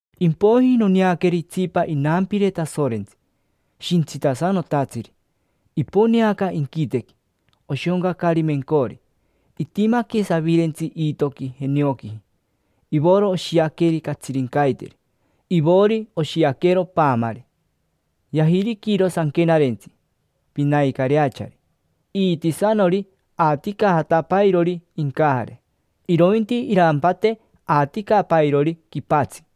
Impoiji noneaqueri itsipa inampire Tasorentsi, shintsitasanotatsiri. Iponeaca inquitequi, oshoncacari mencori, itimaque savirentsi iitoqui jenioquiji. Ivoro oshiaqueri catsirincaiteri, ivori oshiaquero paamari. Yajiriquiro sanquenarentsi, pinaicareachari. Iitisanori aaticajatapairori incajare, irointi irampate aaticapairori quipatsi.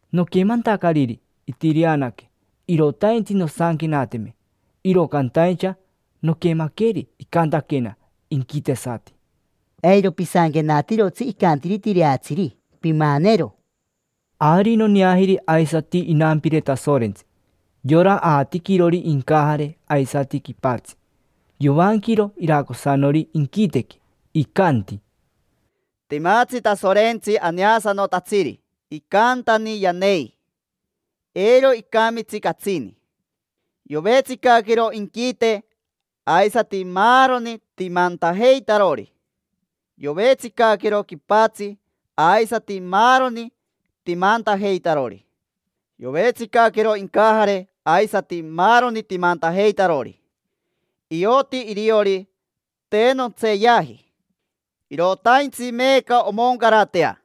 Noquemantacariri itireanaque, irotaintsi nosanquenateme, iro cantaincha noquemaqueri icantaquena inquitesati: —Eiro pisanquenatirotsi icantiri tireatsiri, pimanero. Ari noneajiri aisati inampire Tasorentsi, yora aatiquirori incajare aisati quipatsi: yovanquiro iracosanori inquitequi, icanti: —Timatsi Tasorentsi aneasanotatsiri, icantani yanei, eiro icamitsi catsini. Yovetsicaquero inquite aisati maaroni timantajeitarori; yovetsicaquero quipatsi aisati maaroni timantajeitarori; yovetsicaquero incajare aisati maaroni timantajeitarori. Ioti iriori te nontseeyaji, irotaintsi meeca omoncaratea.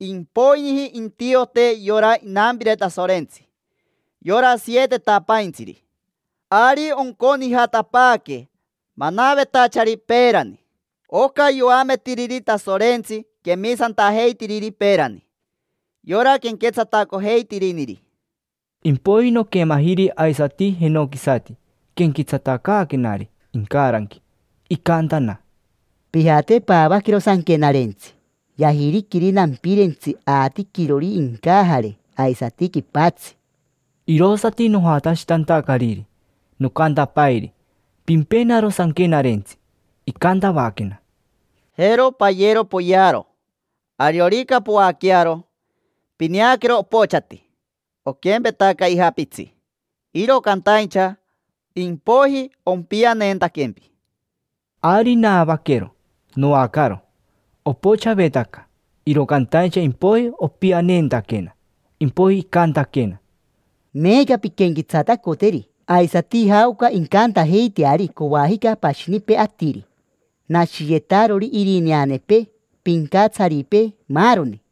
Impoiji intiote yora inampire Tasorentsi, yora sietetapaintsiri. Ari onconijatapaaque manavetachari peerani: oca yoametiriri Tasorentsi quemisantajeitiriri peerani, yora quenquetsatacojeitiriniri. Impoiji noquemajiri aisati jenoquisati quenquetsatacaaquenari incaranqui. Icantana: —Pijate, paavaquero sanquenarentsi yajiriquiri nampirentsi aatiquirori incajare aisati quipatsi. Irosati nojatashitantacariri, nocantapairi: —Pimpenaro sanquenarentsi. Icantavaquena: —Jero, payero, poyearo; ariorica poaquearo, pineaquero opochati, oquempetaca ija pitsi. Iro cantaincha impoiji ompianeentaquempi. Ari naavaquero, noacaro. Opochavetaca, iro cantaincha impoiji opianeentaquena. Impoiji icantaquena: —Meeca pinquenquetsatacoteri aisati jaoca incantajeiteari coajica pashinipee atiri: nashiyetarori irineanepee, pincatsaripee, maaroni.